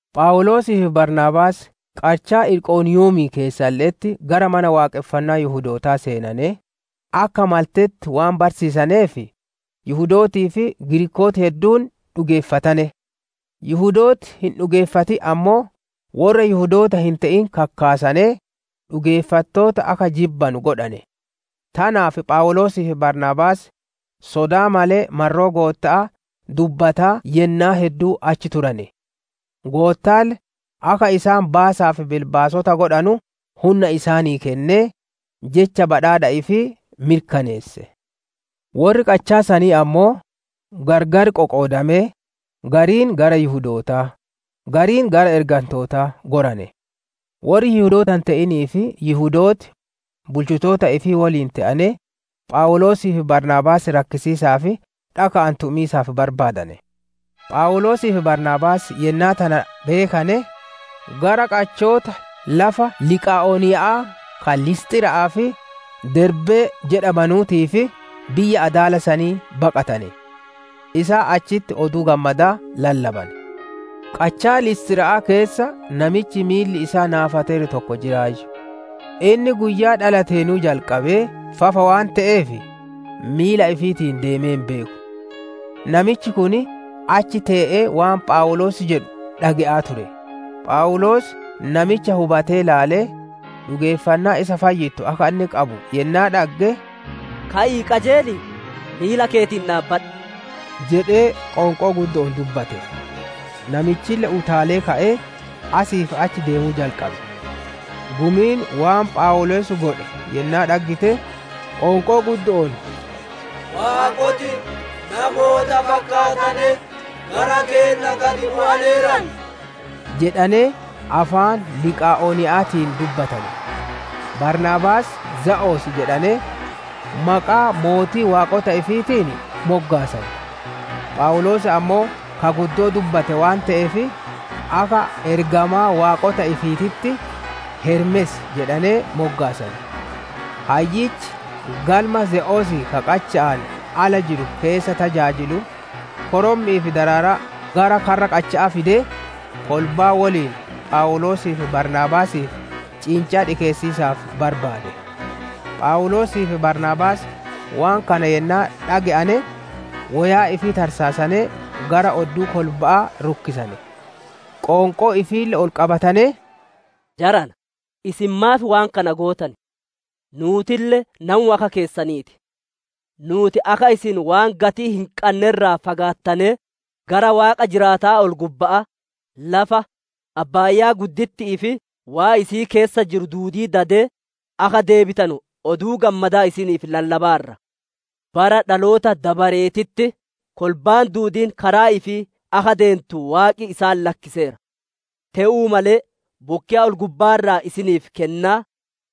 Phawuloosii fi Baarnaabaas qachaa Iqoniiyumii keessalle'etti gara Mana Waaqonfannaa Yihudootaa seenanee, akka maltetti waan barsiisaneef, Yihudootii fi Giriikooti hedduun dhugeeffatane. Yihudooti hin dhugeeffatin ammoo, worra Yihudoota hin te'in kakkaasanee, dhugeeffattoota akka jibbanu godhane. Tanaaf Phawuloosii fi Baarnaabaas, sodaa malee marroo Gootta'aa dubbataa yennaa hedduu achi turane; Goottaalle akka isaan baasaa fi bilbaasota godhanu hunna isaanii kennee, Jecha badhaadha ifii mirkaneesse. Worri qachaa sanii ammoo, gargar qoqoodamee, gariin gara Yihudootaa, gariin gara ergantootaa gorane. Worri Yihudoota hin te'inii fi Yihudooti, bulchitoota ifii woliin te'anee, Phawuloosii fi Baarnaabaas rakkisiisaa fi dhaka'aan tumiisaaf barbaadane. Phawuloosii fi Baarnaabaas yennaa tana beekane, gara qachoota lafa Liqaa'oniya'aa ka Lisxira'aa fi Derbee jedhamanuutii fi biyya adaala sanii baqatane. Isaan achitti Oduu Gammadaa lallabane. Qachaa Lisxira'aa keessa namichi miilli isaa naafateeru tokko jiraayyu; inni guyyaa dhalateenuu jalqabee fafa waan te'eef, miila ifiitiin deemee hin beeku. Namichi kun achi tee'ee waan Phawuloos jedhu dhage'aa ture. Phawuloos namicha hubatee ilaalee, dhugeeffannaa isa fayyittu akka inni qabu yennaa dhagge, «Ka'ii qajeelii, miila keetiin dhaabadhu» jedhee qoonqoo guddo'oon dubbate. Namichille utaalee ka'ee, asii fi achi deemuu jalqabe. Gumiin waan Phawuloos godhe yennaa dhaggite, qoonqoo guddo'oon, «Waaqoti namoota fakkaatanee gara keenna gad bu'aneeran» jedhanee afaan Liqaa'oniya'aatiin dubbatane. Baarnaabaasii, «Ze'os» jedhanee maqaa mootii waaqota ifiitiin moggaasane; Phawuloos ammoo ka guddoo dubbate waan te'eef, akka ergamaa waaqota ifiititti, «Hermees» jedhanee moggaasane. Hayyichi, galma Ze'osii ka qacha'aan ala jiru keessa tajaajilu, korommi'ii fi daraaraa gara karra qacha'aa fidee, kolbaa woliin Phawuloosii fi Baarnaabaasiif ciincaa dhikeessiisaaf barbaade. Phawuloosii fi Baarnaabaas waan kana yennaa dhage'ane woyaa ifii tarsaasanee, gara odduu kolba'aa rukkisane; qoonqoo ifiille ol qabatanee, «Jarana, isin maaf waan kana gootan? Nuutille namuma akka keessanii ti. Nuuti akka isin waan gatii hin qanne irraa fagaattanee, gara Waaqa jiraataa ol-gubbaa, lafa, abbaaya'aa fi waan isii keessa jiru duudii dadee, akka deebitanu Oduu Gammadaa isiniif lallabaarra. Bara dhaloota dabareetitti kolbaan duudiin karaa ifii akka deentu Waaqi isaan lakkiseera. Te'uu malee bokkeya ol-gubbaa irraa isiniif kennaa,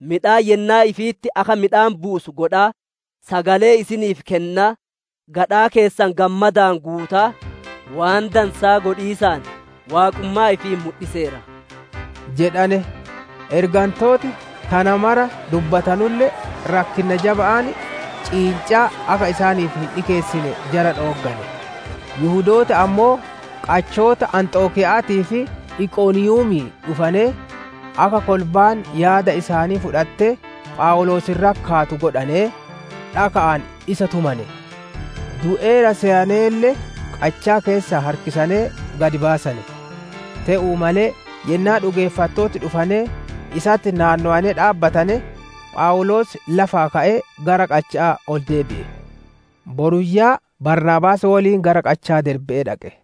midhaan yennaa ifiititti akka midhaan buusuu godhaa, sagalee isiniif kennaa, gadhaa keessan gammadaan guutaa, waan dansaa godhiisaan Waaqummaa ifii mudhiseera» jedhane. Ergantooti tana mara dubbatanulle, rakkinna jaba'aan ciincaa akka isaaniif hin dhikeessine jara dhooggane. Yihudooti ammoo qachoota Anxokiya'aatii fi Iqoniiyumii dhufanee, akka kolbaan yaada isaanii fudhattee Phawuloos irratti kaatu godhanee, dhaka'aan isa tumane; du'eera seyaneelle qachaa keessaa harkisanee gad baasane. Te'uu malee yennaa dhugeeffattooti dhufanee isatti naannowanee dhaabbatane, Phawuloos lafaa ka'ee gara qacha'aa ol deebi'e. Boruyyaa Baarnaabaas woliin gara qachaa Derbe'ee dhaqe.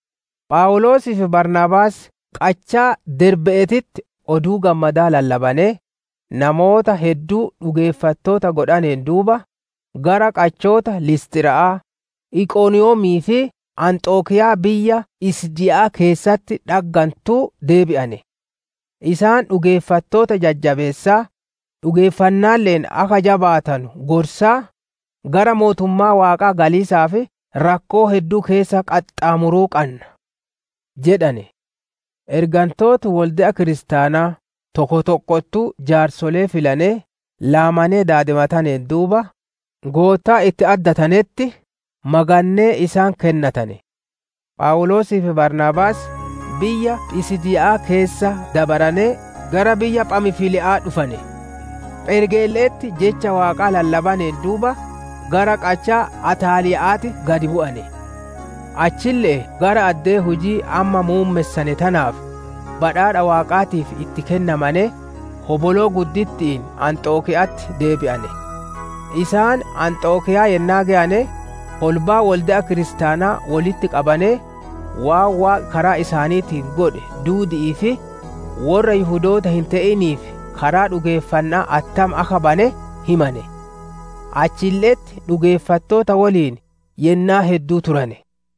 Phawuloosii fi Baarnaabaas qachaa Derbe'eetitti Oduu Gammadaa lallabanee, namoota hedduu dhugeeffattoota godhaneen duuba, gara qachoota Lisxira'aa, Iqoniiyumii fi Anxokiyaa biyya Phisiidiyaa keessatti dhaggantuu deebi'ane. Isaan dhugeeffattoota jajjabeessaa, dhugeeffannaalle'een akka jabaatanu gorsaa, «Gara Mootummaa Waaqaa galiisaaf rakkoo hedduu keessa qaxxaamuruu qanna» jedhane. Ergantooti wolde'a kiristaanaa tokko tokkottuu jaarsolee filanee, laamanee daadimataneen duuba, Goottaa itti addatanetti magannee isaan kennatane. Phawuloosii fi Baarnaabaas biyya Phisiidiyaa keessa dabaranee gara biyya Phamfiliya'aa dhufane. Phergeelle'etti Jecha Waaqaa lallabaneen duuba, gara qachaa Ataalii'aatti gad bu'ane. Achille'ee gara addee hujii amma muummessane tanaaf, badhaadha Waaqaatiif itti kennamanee, hoboloo gudditti'iin Anxokiya'atti deebi'ane. Isaan Anxokiyaa yennaa geyane, kolbaa wolde'a kiristaanaa wolitti qabanee, waan Waaqi karaa isaaniitiin godhe duudi'ii fi worra Yihudoota hin te'iniif karaa dhugeeffanna'aa attam akka bane himane. Achille'etti dhugeeffattoota woliin yennaa hedduu turane.